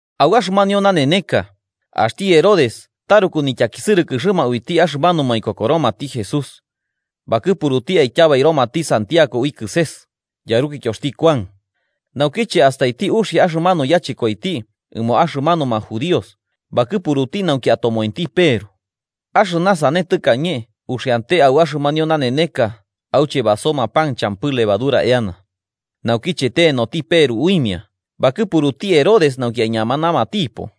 Au axɨmanio naneneka, axti Herodes taruku nityakisɨrɨkɨxɨma uiti axɨmanuma ikokoromati Jesús. Bakɨpuruti aityabaioromati Santiago ui kɨses, yarukityoxti Kuan. Naukiche astaiti uxia axɨmanu yachɨkoiti ɨmo axɨmanuma judíos bakɨpuruti nauki atomoenti Peru. Axɨna sane tɨkañe uxiante au axɨmanio naneneka auche basoma pan champɨ levadura eana. Naukiche tenoti Peru uimia, bakɨpuruti Herodes nauki aiñamanamatipo,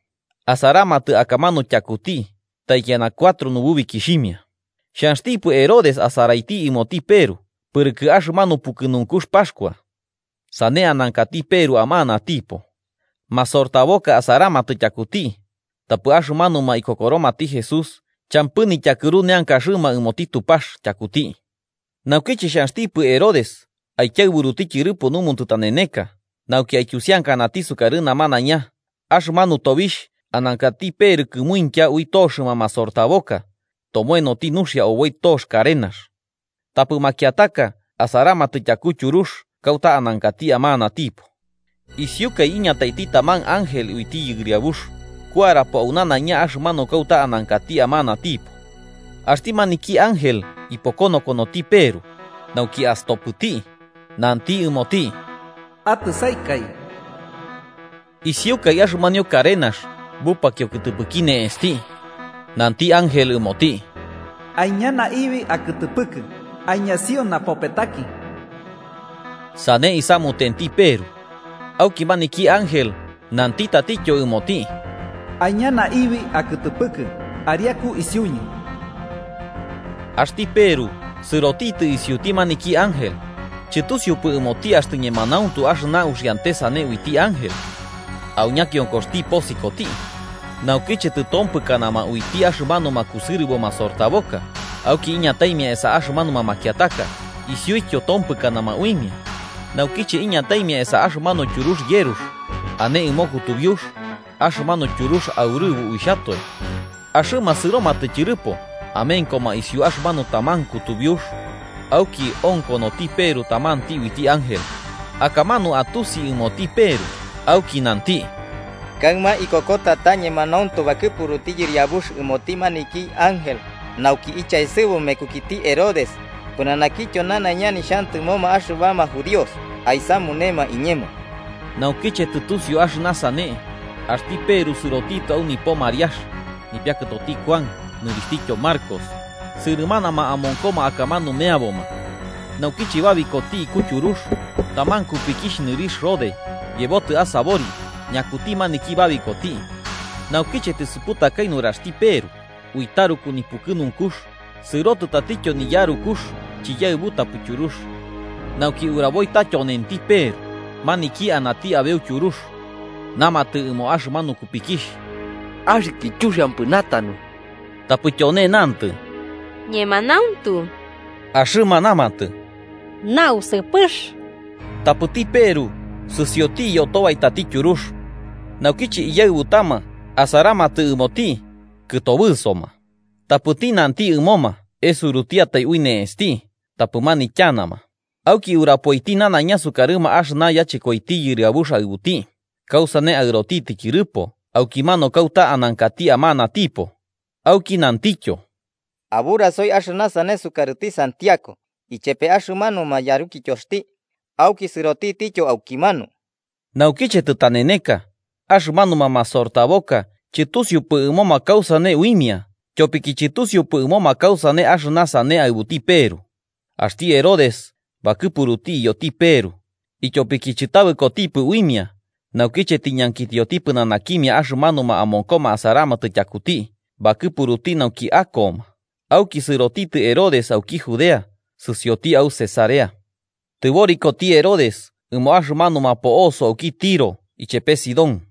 asaramatɨ akamanu tyakuti taikiana cuatro nububikixhimia. Xhanxtipɨ Herodes asaraiti ɨmoti Peru pɨrɨkɨ axɨmanu pukɨnunkux Paxkua. Sane anankati Peru amanatipo. Masortaboka asaramatɨ tyakuti, tapɨ axɨmanuma ikokoromati Jesús champɨ nityakɨru neankaxɨma ɨmoti Tupax tyakuti. Naukiche xhanxtipɨ Herodes aikiaɨburuti tyɨrɨpo numo tɨtaneneka nauki aityusiankanati sukarɨ namanaiña, axɨmanu tobixh, anankati Peru kɨmuintya ui toxɨma masortaboka, tomoenoti nuxia oboi tox karenax. Tapɨ makiataka asaramatɨ tyaku tyurux kauta anankati amanatipo. Isiukai iñataiti tamanti ángel uiti Yɨriabux, kuarapo au nanaiña axɨmanu kauta anankati amanatipo. Axti maniki ángel ipokonokonoti Peru, nauki astopɨti, nanti ɨmoti: “¡Atɨsaikaɨ!” Isiukai axɨmanio karenax bupakio kɨtɨpɨki ne'esti. Nanti ángel ɨmoti: “Aiña naibi akɨtɨpɨkɨ, aiñasio napopetaki.” Sane isamutenti Peru, auki maniki ángel nanti tatityo ɨmoti: “Aiña naibi akɨtɨpɨkɨ ariaku isiuñɨ.” Axti Peru sɨrotitɨ isiuti maniki ángel. Chɨtusiupɨ ɨmoti axtɨ ñemanauntu axɨna uxiante sane uiti ángel. Au ñakionkoxti posikoti. Naukiche tɨtompɨkana uimia axɨmanu kusɨrɨbo masortaboka, auki iñataimia esa axɨmanuma makiataka isiuityo tompɨkana uimia, naukiche iñataimia esa axɨmanu tyurux yerux, ane ɨmo kutubiux, axɨmanu tyurux aurɨbo uixhatoe. Axɨma sɨromatɨ tyɨrɨpo, amenkoma isiu axɨmanu taman kutubiux, auki onkonoti Peru tamanti uiti ángel. Akamanu atusi ɨmoti Peru, auki nanti: “Kaɨma ikokota ta ñemanauntu bakɨpuruti Yɨriabux ɨmoti maniki ángel nauki ichaesɨbu mekukiti Herodes pɨnanakityo nanaiña nixhantɨmoma axɨbama judíos aisamunema iñemo.” Naukiche tɨtusiu axɨna sane, axti Peru sɨrotitɨ au nipo Mariax, nipiakɨtoti Kuan nɨrixhtityo Marcos, sɨrɨmanama amonkoma akamanu meaboma. Naukiche babikoti iku tyurux, taman kupikixh nɨrixh Rode yebotɨ asabori ñakuti maniki babikoti. Naukiche tisuputakai nuraxti Peru, ui taruku nipukɨnunkux sɨrotɨ tatityopo niyarukux chiyaɨbutapɨ tyurux, nauki uraboi ta tyonenti Peru maniki anati abeu tyurux. Namatɨ ɨmo axɨmanu kupikixh: –¡Axɨkɨ chuxiampɨ natanu! Tapɨ tyone nantɨ ta ñemanauntu. Axɨma namatɨ: –¡Nausɨpɨxti! Tapɨti Peru sɨsioti iyotobaitati tyurux. Naukiche iyaɨbutama asaramatɨ ɨmoti, kɨtobɨsoma. Tapɨti nanti ɨmoma esurutiatai ui ne'esti tapɨ manityanama, auki urapoiti nanaiña sukarɨma axɨna yachɨkoiti Yɨriabux aɨbuti, kausane aɨrotitɨ tyɨrɨpo aukimanu kauta anankati amanatipo. Auki nantityo: –Aburasoi axɨna sane sukarɨti Santiago ichepe axɨmanuma yarukityoxti, auki sɨrotitityo aukimanu. Naukiche tɨtaneneka, axɨmanuma masortaboka chɨtusiupɨ ɨmoma kausane uimia tyopiki chɨtusiupɨ ɨmoma kausane axɨna sane aɨbuti Peru. Axti Herodes bakɨpuruti iyoti Peru, ityopiki chɨtabɨkotipɨ uimia, naukiche tiñankitioti pɨnanakimia axɨmanuma amonkoma asaramatɨ tyakuti bakɨpuruti nauki akoma auki sɨrotitɨ Herodes auki Judea sɨsioti au Cesarea. Tɨborikoti Herodes ɨmo axɨmanuma po'osoma auki Tiro ichepe Sidón.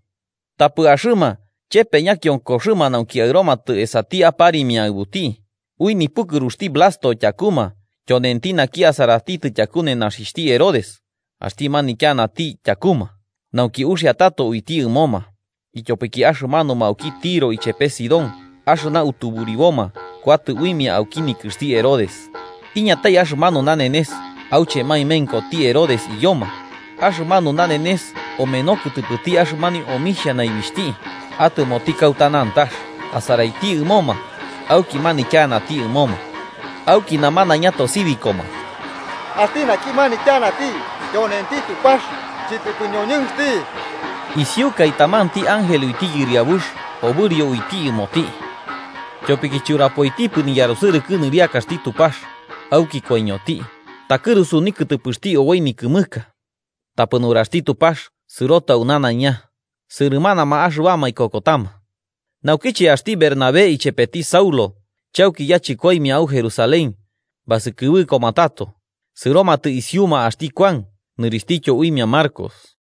Tapɨ axɨma chepe ñakionkoxɨma nauki aɨromatɨ esati aparimia aɨbuti, ui nipukɨruxti Blasto tyakuma, tyonenti naki asaratitɨ tyaku nenaxixhti Herodes, axti manityanati tyakuma nauki uxia tato uiti ɨmoma, ityopiki axɨmanuma auki Tiro ichepe Sidón axɨna utuburiboma kuatɨ uimia auki nikɨxti Herodes. Iñatai axɨmanu nanenes auche maemenkoti Herodes iyoma, axɨmanu nanenes omeno kɨtɨpɨti axɨmanio omixhia naibixhti, atɨmoti kauta nantax asaraiti ɨmoma, auki manityanati ɨmoma. Auki namanaiña tosibikoma: “¡Axti naki manityanati tyonenti Tupax, chɨtɨpɨ ñoñɨnxti!” Isiukai, tamanti ángel uiti Yɨriabux obɨrio uiti ɨmoti. Tyopiki churapoitipɨ niyarusɨrɨkɨ nɨriakaxti Tupax, auki koiñoti, takɨrusu nikɨtɨpɨxti oboi nikɨmɨka. Tapɨ nuraxti Tupax sɨrotɨ au nanaiña, sɨrɨmanama axɨbama ikokotama. Naukiche axti Bernabé ichepeti Saulo, chauki yachɨkoimia au Jerusalén, basɨkɨbɨkoma tato, sɨrotitɨ isiuma axti Kuan nɨrixhtityo uimia Marcos.